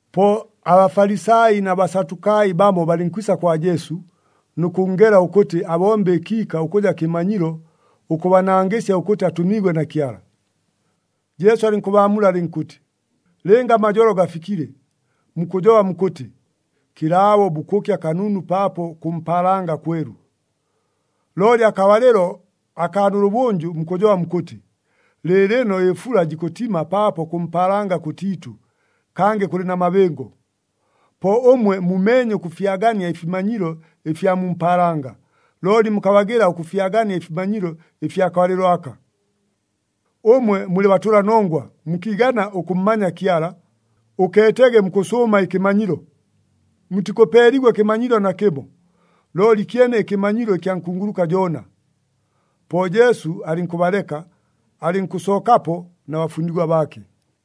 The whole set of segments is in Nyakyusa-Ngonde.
Po aBafalisai na Basatukai bamo balɨnkwisa kwa Jesu, nʉ kʉnngela ʉkʉtɨ abombe ɨkiika ʉkʉja kɨmanyilo ʉkʉbanangɨsya ʉkʉtɨ atʉmiigwe na Kyala. Jesu alɨnkʉbaamula alɨnkʉtɨ, “Lɨnga amajolo gafikile, mukʉjoba mukʉtɨ, ‘Kɨlaabo bukʉkya kanunu paapo kʉ mpaalanga kwelu.’ Looli akabalɨlo akaa nʉlʉbʉnjʉ, mukʉjoba mukʉtɨ, ‘Lɨɨlɨno ɨfula jikʉtima paapo kʉ mpaalanga kʉtiitʉ, kangɨ kʉlɨ na mabɨngo.’ Po ʉmwe mumeenye ʉkʉfyagania ɨfimanyilo ɨfya mu mpaalanga, looli mukabagɨla ʉkʉfyagania ɨfimanyilo ɨfya kabalɨlo aka. Ʉmwe mulɨ batʉlanongwa mukiigana ʉkʉmmanya Kyala, ʉkeetege mukʉsʉʉma ɨkɨmanyilo! Mutikʉpeeligwa ɨkɨmanyilo nakɨmo, looli kyene ɨkɨmanyilo ɨkya nkunguluka Joona.” Po Jesu alɨnkʉbaleka, alɨnkʉsookapo na bafundigwa baake.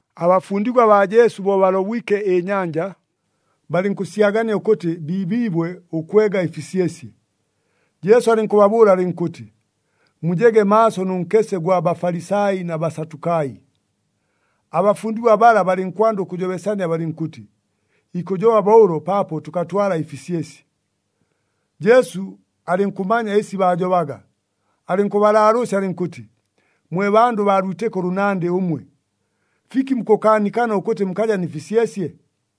Abafundigwa baa Jesu bo balobwike ɨnyanja, balɨnkʉsyagania ʉkʉtɨ biibiibwe ʉkwega ɨfisyesye. Jesu alɨnkʉbabʉʉla alɨnkʉtɨ, “Mujege maaso nʉ nkese ʉgwa Bafalisai na Basatukai.” Abafundigwa bala balɨnkwanda ʉkʉjobesania balɨnkʉtɨ, “Ikʉjoba bo ʉlo paapo tʉkatwala ɨfisyesye.” Jesu alɨnkʉmanya ɨsi baajobaga, alɨnkʉbalaalʉʉsya alɨnkʉtɨ, “Mwe bandʉ baa lwitɨko ʉlʉnandɨ ʉmwe! Fiki mukʉkaanikana ʉkʉtɨ mukaja nɨ fisyesye?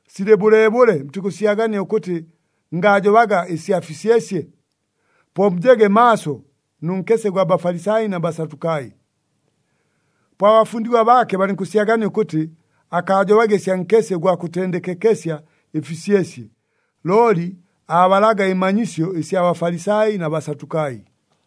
Silɨ bʉleebʉle, mutikʉsyagania ʉkʉtɨ ngaajobaga ɨsya fisyesye? Po mujege maaso nʉ nkese ʉgwa Bafalisai na Basatukai.” Po abafundigwa baake balɨnkʉsyagania ʉkʉtɨ akaajobaga ɨsya nkese ʉgwa kʉtendekekesya ɨfisyesye, looli aabalaga ɨmanyisyo ɨsya Bafalisai na Basatukai.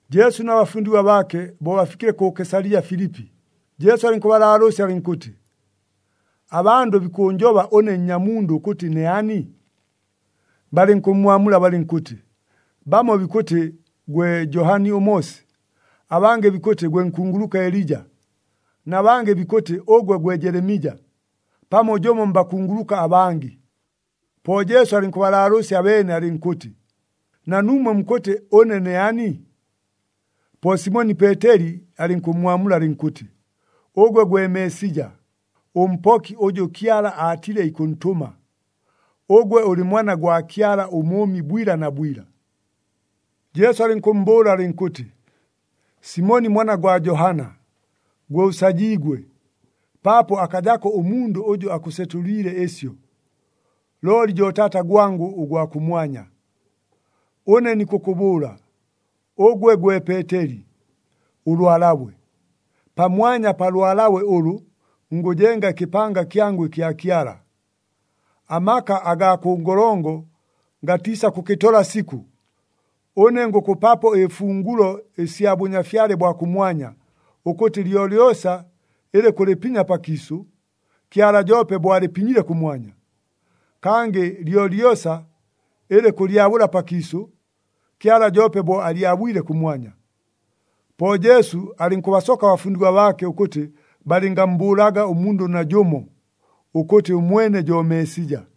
Jesu na bafundigwa baake, bo bafikile kʉ Kesalija Filipi, Jesu alɨnkʉbalaalʉʉsya alɨnkʉtɨ, “Abandʉ bikʉʉnjoba ʉne Nnyamundʉ ʉkʉtɨ ne ani?” Balɨnkʉmmwamula balɨnkʉtɨ, “Bamo bikʉtɨ gwe Johani ʉMoosi, abangɨ bikʉtɨ gwe nkunguluka Elija, na bangɨ bikʉtɨ ʉgwe gwe Jelemija, pamo jʉmo mbakunguluka abangɨ.” Po Jesu alɨnkʉbalaalʉʉsya abeene, alɨnkʉtɨ, “Na nuumwe mukʉtɨ, ʉne ne ani?” Po Simoni Peeteli alɨnkʉmmwamula alɨnkʉtɨ, “Ʉgwe gwe Meesija, ʉMpoki ʉjʉ Kyala aatile ikʉntʉma. Ʉgwe ʉlɨ Mwana gwa Kyala ʉMʉʉmi bwila na bwila.” Jesu alɨnkʉmmbʉʉla alɨnkʉtɨ, “Simoni mwana gwa Joona, gwe ʉsajiigwe, paapo akajako ʉmundʉ ʉjʉ akʉsetʉliile ɨsyo, looli jo Taata gwangʉ ʉgwa kʉmwanya. Ʉne nikʉkʉbʉʉla, ʉgwe gwe Peeteli, ʉlwalabwe. Pamwanya pa lwalabwe ʉlʉ, ngʉjenga ɨkɨpanga kyangʉ ɨkya Kyala. Amaka agaa kʉ ngolongo gatiisakʉkɨtola sikʉ. Ʉne ngʉkʉpapo ɨfungulo ɨsya Bʉnyafyale bwa kʉmwanya, ʉkʉtɨ lyolyosa ɨlɨ kʉlɨpinya pakiisʉ, Kyala joope bo alɨpinyile kʉmwanya. Kangɨ lyolyosa ɨlɨ kʉlyabʉla pakiisʉ, Kyala joope bo alyabwile kʉmwanya.” Po Jesu alɨnkʉbasoka abafundigwa baake ʉkʉtɨ balɨngammbʉʉlaga ʉmundʉ najʉmo, ʉkʉtɨ ʉmwene jo Meesija.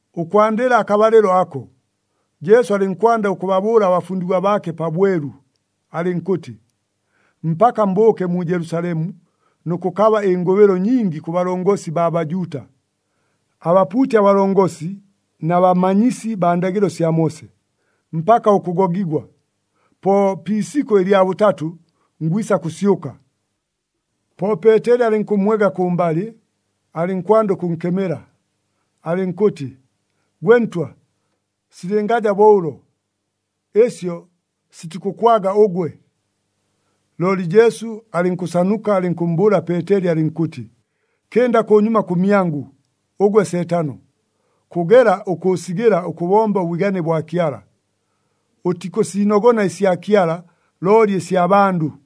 Ʉkwandɨla akabalɨlo ako, Jesu alɨnkwanda ʉkʉbabʉʉla abafundigwa baake pabwelu, alɨnkʉtɨ, “Mpaka mbʉʉke mu Jelusalemu nʉ kʉkaba ɨngʉbɨlo nyingi kʉ balongosi baa Bajuuta, abapuuti abalongosi, na bamanyisi baa ndagɨlo sya Moose, mpaka ʉkʉgogigwa. Po pi isikʉ lya bʉtatʉ, ngwisa kʉsyʉka.” Po Peeteli alɨnkʉmmwega kʉmbalɨ, alɨnkwanda ʉkʉnkemela, alɨnkʉtɨ, “Gwe Ntwa, silɨngaja bo ʉlo! Ɨsyo sitikʉkwaga ʉgwe!” Looli Jesu alɨnkʉnsanuka, alɨnkʉmmbʉʉla Peeteli alɨnkʉtɨ, “Kɨnda kʉnyuma kʉmyangʉ, ʉgwe Seetano! Kʉgela ʉkʉʉsigɨla ʉkʉbomba ʉbwigane bwa Kyala! Ʉtikʉsiinogona ɨsya Kyala, looli ɨsya bandʉ!”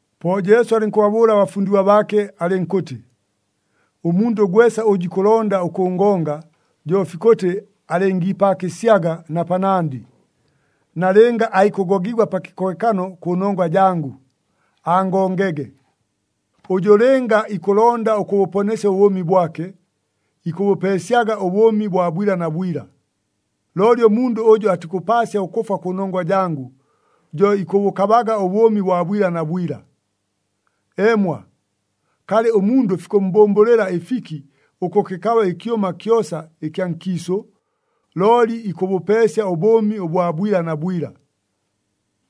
Po Jesu alɨnkʉbabʉʉla abafundigwa baake alɨnkʉtɨ, “Ʉmundʉ gwesa ʉjʉ ikʉlonda ʉkʉngonga, jo fikʉtɨ alɨngiipaakɨsyaga na panandɨ, nalɨnga aikʉgogigwa pa kɨkohekano kʉnongwa jangʉ, angongege. Ʉjʉ lɨnga ikʉlonda ʉkʉbʉponesya ʉbʉʉmi bwake, ikʉbʉpeesyaga ʉbʉʉmi bwa bwila na bwila. Looli ʉmundʉ ʉjʉ atikʉpaasya ʉkʉfwa kʉnongwa jangʉ, jo ikʉbʉkabaga ʉbʉʉmi bwa bwila na bwila. Eemwa, kalɨ ʉmundʉ fikʉmmbʉmbʉlɨla ɨfiki ʉkʉkɨkaba ɨkyʉma kyosa ɨkya nkiisʉ, looli ikʉbʉpeesya ʉbʉʉmi bwa bwila na bwila?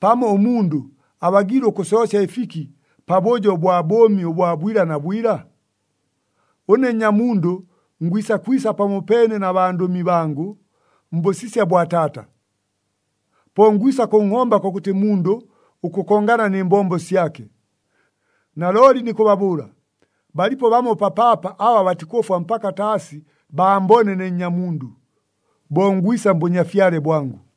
Pamo ʉmundʉ abagiile ʉkʉsoosya ɨfiki pabʉjo bwa bʉʉmi bwa bwila na bwila? Ʉne Nnyamundʉ ngwisa kwisa pamopeene na bandʉmi bangʉ, mbʉsisya bwa Taata. Po ngwisa kʉnhomba kʉkʉtɨ mundʉ ʉkʉkongana nɨ mbombo syake. Nalooli nikʉbabʉʉla, balipo bamo papaapa aba batikʉfwa mpaka taasi baambone ne Nnyamundʉ, bo ngwisa mBʉnyafyale bwangʉ.”